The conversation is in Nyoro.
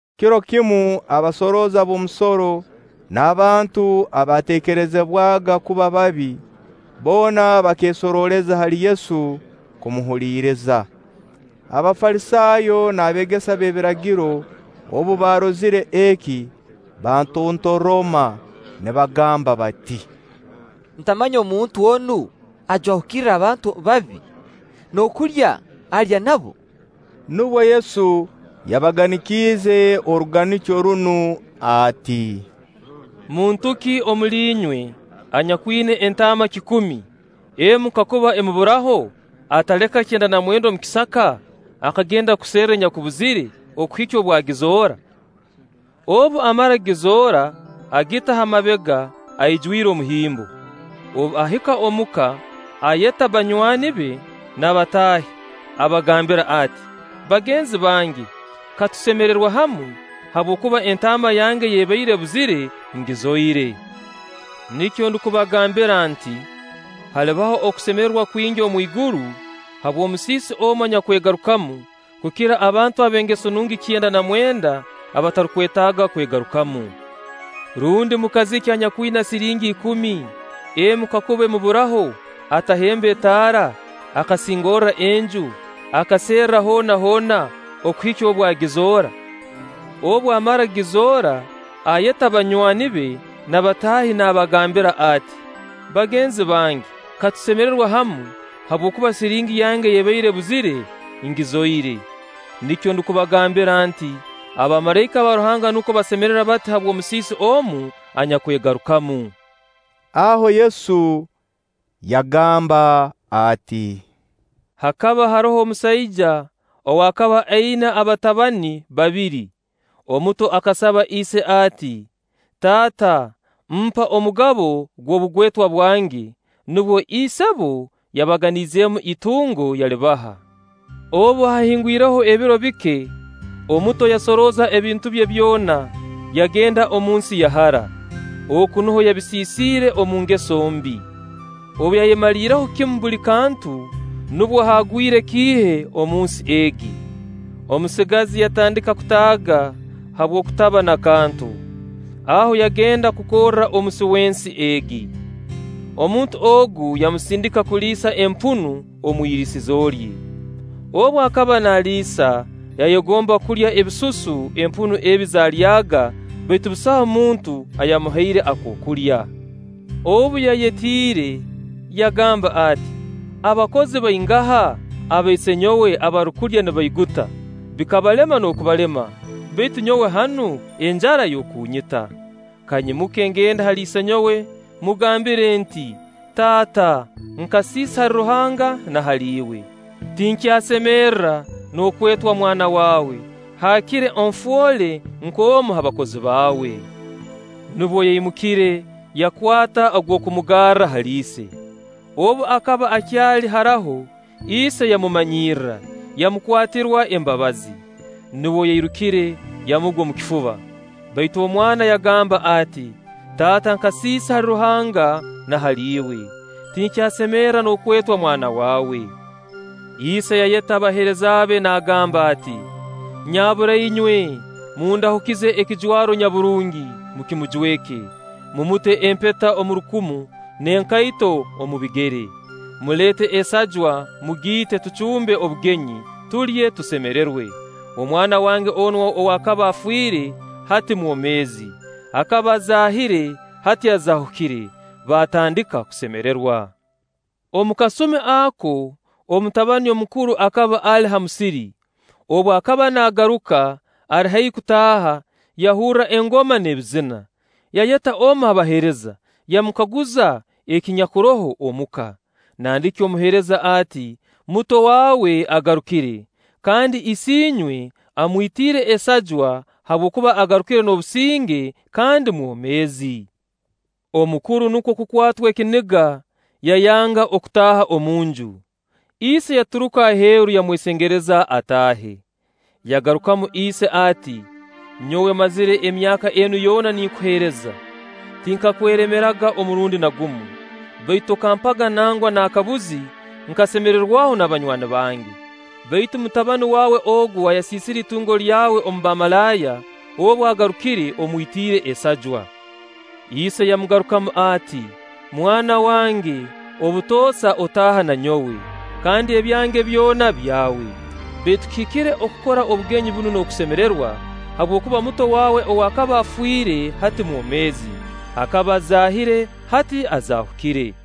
Kiro kimu abasorooza b'omusoro n'abantu abateekerezebwaga kuba babi, boona bakeesorooleza hali Yesu kumuhuliriiza. Abafalisaayo n'abeegesa b'ebiragiro obu baarozire eki, baatontoroma nibagamba bati: “Ntamanya omuntu onu ajwahukirra abantu babi, n'okulya alya nabo!” Nubwo Yesu yabaganikiize oruganikyo runu ati: “Muntu ki omuli inywe anyakwina entaama kikumi, emu kakuba emuburaho, ataleka kyenda na mwenda omu kisaka akagenda kuserra enyakubuzire, okuhikya obu agizoora? Obu amara kugizoora, agita ha mabega aijwire omuhimbo. Obu ahika omuka ayeta banywani be n'abataahi, abagambira ati: ‘Bagenzi bange, katusemererwe hamu habwokuba entaama yange ey'abaire ebuzire ngizoire.’ Nikyo ndukubagambira nti: Halibaho okusemererwa kwingi omwiguru habw'omusiisi omu anyakwegarukamu, kukira abantu ab'engeso nungi kyenda na mwenda abatarukwetaaga kwegarukamu.” “Rundi mukazi ki anyakwina siringi ikumi, emu kakuba emuburaho atahemba etaara, akasingorra enju, akaserra hoona hoona okuhikya obu agizoora? Obu amara kugizoora, ayeta banywani be n'abataahi nabagambira ati: ‘Bagenzi bange, katusemererwe hamu, habwokuba siringi yange ey'ebaire ebuzire ngizoire.’ Nikyo ndukubagambira nti: Abamalaika ba Ruhanga nukwo basemererwa bati habw'omusiisi omu anyakwegarukamu.” Aho Yesu yagamba ati: “Hakaba haroho omusaija ow'akaba aina abatabani babiri. Omuto akasaba ise ati: ‘Taata, mpa omugabo gw'obugwetwa bwange.’ Nubwo isebo yabaganizeemu itungo, yalibaha. Obu haahingwireho ebiro bike, omuto yasorooza ebintu bye byona, yagenda omunsi ya hara. Oku nuho yabisiisire omu ngeso mbi. “Obu yayemaliireho kimu buli kantu, nubwo haagwire kiihe omunsi egi. Omusigazi yatandika kutaaga habw'okutaa n'akantu. Aho yagenda kukorra omusi w'ensi egi. Omuntu ogu yamusindika kuliisa empunu omu iriisizo lye. Obu akaba naaliisa yayegomba kulya ebisusu empunu ebi zaalyaga, baitu busaho muntu ayamuhaire akookulya. Obu, yayetiire, yagamba ati: Abakozi baingaha aba isenyowe abarukulya nibaiguta, bikabalema n'okubalema; baitu nyowe hanu, enjara y'okunyita! Kanyimuke ngende hali isenyowe mmugambire nti: ‘Taata, nkasiisa hali Ruhanga na hali iwe. Tinkyasemerra n'okwetwa mwana waawe; haakire onfoole nk'omu ha bakozi baawe.’ Nubwo yaimukire yakwata ogw'okumugarra hali ise. “Obu akaba akyali haraho, ise yamumanyirra, yamukwatirwa embabazi. Nubwo yairukire, yamugwa omu kifuba. Baitu omwana yagamba ati: ‘Taata nkasiisa hali Ruhanga na hali iwe. Tinkyasemerra n'okwetwa mwana waawe.’ Ise yayeta abaheereza be nagamba ati: ‘Nyabura inywe mundahukize ekijwaro nyaburungi, mukimujweke. Mumute empeta omu rukumu n'enkaito omu bigere. Muleete esajwa, mugiite, tucumbe obugenyi; tulye tusemererwe. Omwana wange onu ow'akaba afiire, hati mwomeezi: akaba azaahire, hati azaahukire.’ Baatandika kusemererwa. “Omu kasumi ako, omutabani omukuru akaba ali ha musiri. Obu akaba naagaruka, ali haihi kutaaha, yahurra engoma n'ebizina. Yayeta omu ha baheereza, yamukaguza ekinyakuroho omu ka. Nandiki omuheereza ati: ‘Muto waawe agarukire, kandi isiinywe amwitiire esajwa habwokuba agarukire n'obusinge kandi mwomeezi.’ Omukuru nukwo kukwatwa ekiniga yayanga okutaaha omunju. Ise yaturuka aheeru yamwesengereza ataahe. Yagarukamu ise ati: ‘Nyowe mmazire emyaka enu yoona ninkuheereza. Tinkakweremeraga omurundi na gumu. Baitu tokampaga nangwa n'akabuzi nkasemererwaho n'abanywani bange. Baitu mutabani waawe ogu ayasiisire itungo lye omu bamalaaya, obu agarukire, omwitiire esajwa!’ Ise yamugarukamu ati: ‘Mwana wange, obutoosa otaaha na nyowe, kandi ebyange byona byawe. Baitu kihikire okukora obugenyi bunu n'okusemererwa, habwokuba muto waawe ow'akaba afiire, hati mwomeezi; akaba azaahire, hati azaahukire.’”